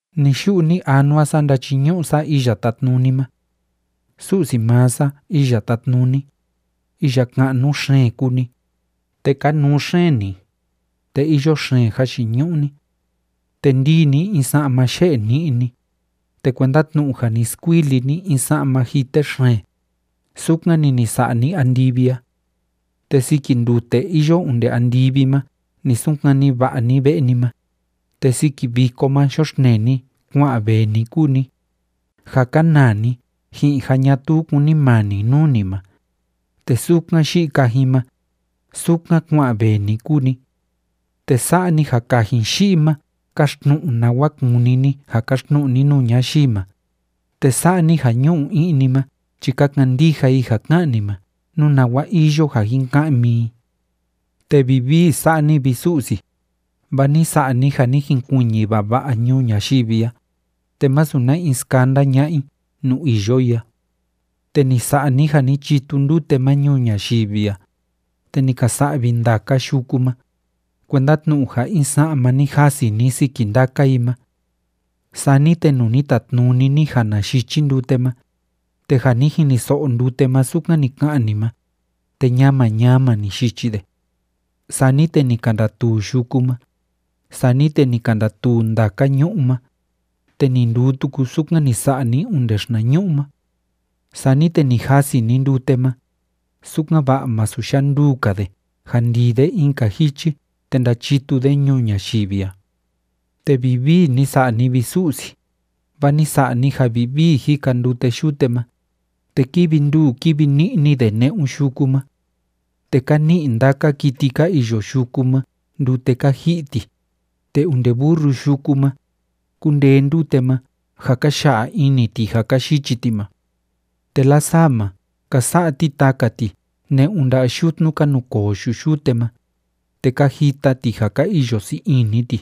Ni‑yu'u ni‑anua sa ndachiñu'u sa Iya Tátnuni ma. Su'si maa sa, Iya Tátnuni, iya ka'nu xeen kúu ni, te kanuu xeen ni, te iyo xeen jayiñu'u ni. Te ndíi ni in sa'ma yé'e ni'ni, te kuenda tnu'u ja ni skuili ni in sa'ma jite xeen, sukan‑ni ni sa'a ni andivi a. Te siki ndute iyo onde andivi ma ni sunkani va'a ni ve'e ni ma, te siki viko ma yoxtnee ni kua'an vee ni kúu ni, ja kánaa ni ji'in ja ñatuu kúnimani nuu ni ma, te sukan yi'i kajin ma, sukan kua'an vee ni kúu ni. Te sa'a ni ja kajin yi'i ma káxtnu'u nawa kúni ni ja káxtnu'u ni nuu ñayii ma, te sa'a ni ja ñu'u i'ni ma chi ka kandija i ja ká'an ni ma nú nawa iyo ja jin ka'mi i. Te vivii sa'a ni, vi Su'si, vaa ni sa'a ni ja ni jinkuiñi vava'a ñuu ñayivi a, te masu na in skanda ña'a i nuu iyo i a. Te ni sa'a ni ja ni chitu ndute ma ñuu ñayivi a, te ni ka sa'vi ndaka yuku ma, kuenda tnu'u ja in sa'ma ni jasi ni siki ndaka i ma. Sani te nuu ni tatnuni ni ja na yichi ndute ma, te ja ni jiniso'o ndute ma sukan ni ka'an ni ma, te ñama ñama ni yichi de. Sani te ni ka ndatuu yuku ma, sani te ni ka ndatuu ndaka ñu'ú ma, te ni nduu tuku sukan ni sa'a ni onde xinañu'u ma. Sani te ni jasi ni ndute ma, sukan‑va'a masu yanduu‑ka de ja ndii de in‑ka jichi te ndachitu de ñuu ñayivi a. Te vivii ni sa'a ni, vi Su'si, vaa ni sa'a ni ja vivii jika ndute yute ma, te kívi nduu kívi ni'ni de ne'un yuku ma. Te ka ni'i ndaka kiti ka iyo yuku ma ndute ka ji'i ti, te onde burru yuku ma, kúndee ndute ma ja ka ya'a ini ti ja ka yichi ti ma. Te lasaa ma, ka sa'a ti taka ti ne'un nda'a yutnu ka nukoo yu'u yute ma, te ka jita ti ja ka iyo sii ini ti.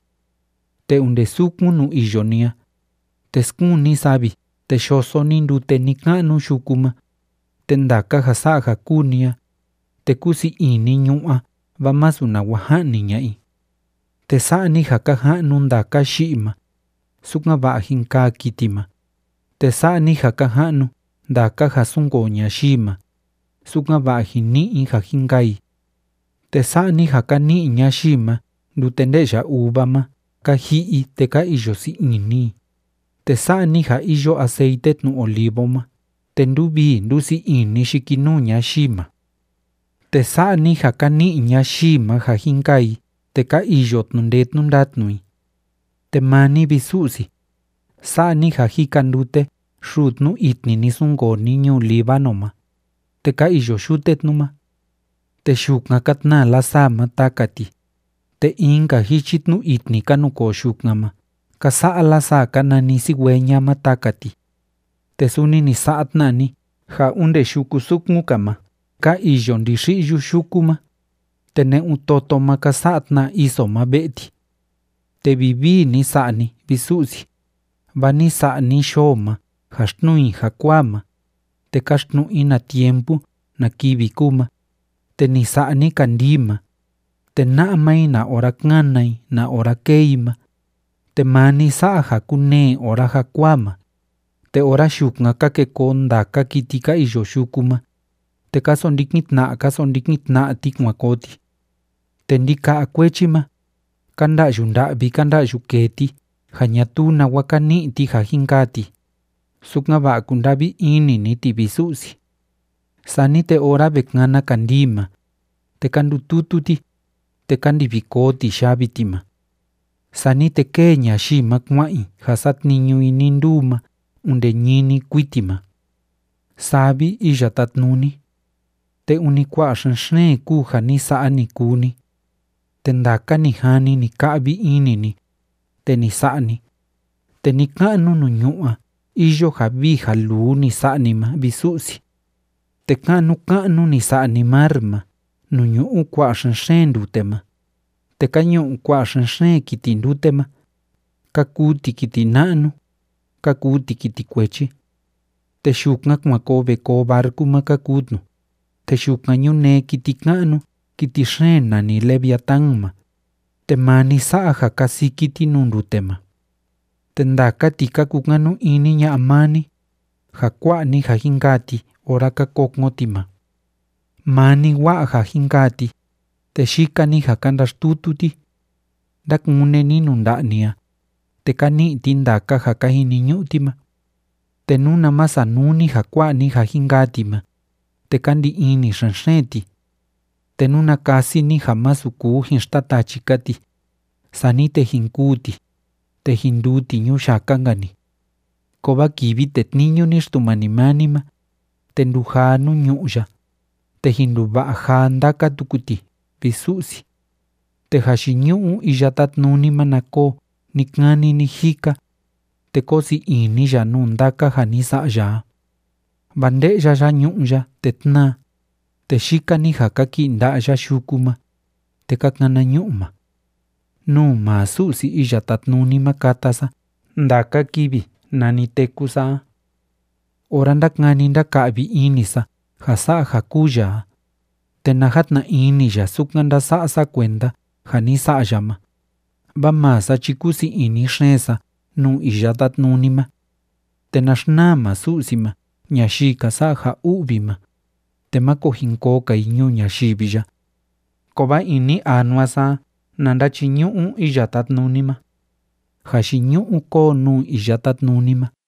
Te onde sukun nuu iyo ni a, te skuun ni savi te yoso ni ndute ni‑ka'nu yuku ma, te ndaka ja sa'a ja kúu ni a, te kúu sii ini ñu'ú a vaa masu nawa ja'ni ña'a i. Te sa'a ni ja ka ja'nu ndaka yi'i ma, sukan‑va'a jin kaa kiti ma, te sa'a ni ja ka ja'nu ndaka ja súnkoo ñayii ma, sukan‑va'a jin ni'i i ja jin kaa i. Te sa'a ni ja ka ni'i ñayii ma ndute nde'ya uva ma ka ji'i i te ka iyo sii ini i, te sa'a ni ja iyo aceite tnu olivo ma te ndúvii ndúsii ini yikinuu ñayii ma, te sa'a ni ja ka ni'i ñayii ma ja jin kaa i te ka iyo tnu'u ndee tnu'u ndatnu i. Te maa ni, vi Su'si, sa'a ni ja jika ndute xuu tnu itni ni sunkoo ni ñuu Líbano ma, te ka iyo yute tnu ma. Te yukan ka tnaa lasaa ma taka ti, te in‑ka jichi tnu itni ka nukoo yukan ma ka sa'a lasaa ka nani cigüeña ma taka ti. Te suni ni sa'a tna ni ja onde yuku sukun‑ka ma ka iyo ndixi'yu yuku ma, te ne'un toto ma ka sa'a tna iso ma ve'e ti. Te vivii ni sa'a ni, vi Su'si, vaa ni sa'a ni yoo ma ja xtnuu i jakuaa ma, te káxtnu'u i na tiempo na kivi kúu ma, te ni sa'a ni kandii ma, te na'a maa i na ora kána i na ora kée i ma. Te maa ni sa'a ja kúnee ora jakuaa ma, te ora yukan ka ke koo ndaka kiti ka iyo yuku ma, te ka sondikin tna'a ka sondikin tna'a ti kuan koo ti. Te ndika'a kuechi ma, ka nda'yu nda'vi ka nda'yu kee ti ja ñatuu nawa ka ni'i ti ja jin kaa ti, sukan‑va'a kunda'vi ini ni ti, vi Su'si. Sani te ora ve kana kandii ma, te ka ndututu ti, te ka ndivi koo ti yavi ti ma. Sani te kée ñayii ma kua'an i ja satniñu i nii nduu ma onde ñini kuiti ma. ¡Saa vi, Iya Tátnuni, te ûni kua'a xen‑xeen kúu ja ni sa'a, ni kuu ni! Te ndaka ni jani, ni ka'vi ini ni, te ni sa'a ni, te ni‑ka'nu nuu ñu'ú a iyo ja vii ja luu ni sa'a ni ma, vi Su'si. Te ka'nu ka'nu ni sa'a ni mar ma nuu ñu'u kua'a xen‑xeen ndute ma, te ka ñu'u kua'a xen‑xeen kiti ndute ma, ka kuu ti kiti na'nu, ka kuu ti kiti kuechi. Te yukan kuan koo ve koo barcu ma ka kuu tnu, te yukan ñunee kiti ka'nu kiti xeen nani leviatán ma, te maa ni sa'a ja kasiki ti nuu ndute ma. Te ndaka ti ka kukanu ini ña'a maa ni, ja kua'a ni ja jin kaa ti ora ka kokon ti ma. Maa ni wa'a ja jin kaa ti, te yika‑ni ja ka ndaxtutu ti. Ndákune ni nuu nda'a ni a, te ka ni'i ti ndaka ja ka jiniñu'u ti ma. Te nuna ma sanuu ni ja kua'a ni ja jin kaa ti ma, te ka ndi ini xen‑xeen ti. Te nuna kasi ni ja masu kuu jin xtatachi‑ka ti, sani te jin kûu ti, te jin nduu ti ñuyaka‑nka‑ni. Kovaa kivi tetniñu ni Xtumani maa ni ma, te ndujaa nuu ñu'ú ya, te jin nduva'a jaa ndaka tuku ti, vi Su'si. Te jayiñu'u Iya Tátnuni ma na koo ni‑kani ni‑jika, te kóo sii ini ya nuu ndaka ja ni sa'a ya a. Vaa nde'ya ya ñu'ú ya, te tnáa, te yika‑ni ja kaki'i nda'a ya yuku ma, te ka kana ñu'ma. Nuu maa Su'si Iya Tátnuni ma kata sa ndaka kivi nani téku sa a. Ora ndákani ndáka'vi ini sa ja sa'a ja kúu ya a, te na jatna ini ya sukan ndása'a sa kuenda ja ni sa'a ya ma, vaa maa sa chi kúu sii ini xeen sa nuu Iya Tátnuni ma. Te na xnaa maa Su'si ma ñayii ka sa'a ja u'vi ma, te máko jin koo‑ka i ñuu ñayivi ya. Kovaa ini anua sa a na ndachiñu'u Iya Tátnuni ma. ¡Jayiñu'u kóo nuu Iya Tátnuni ma!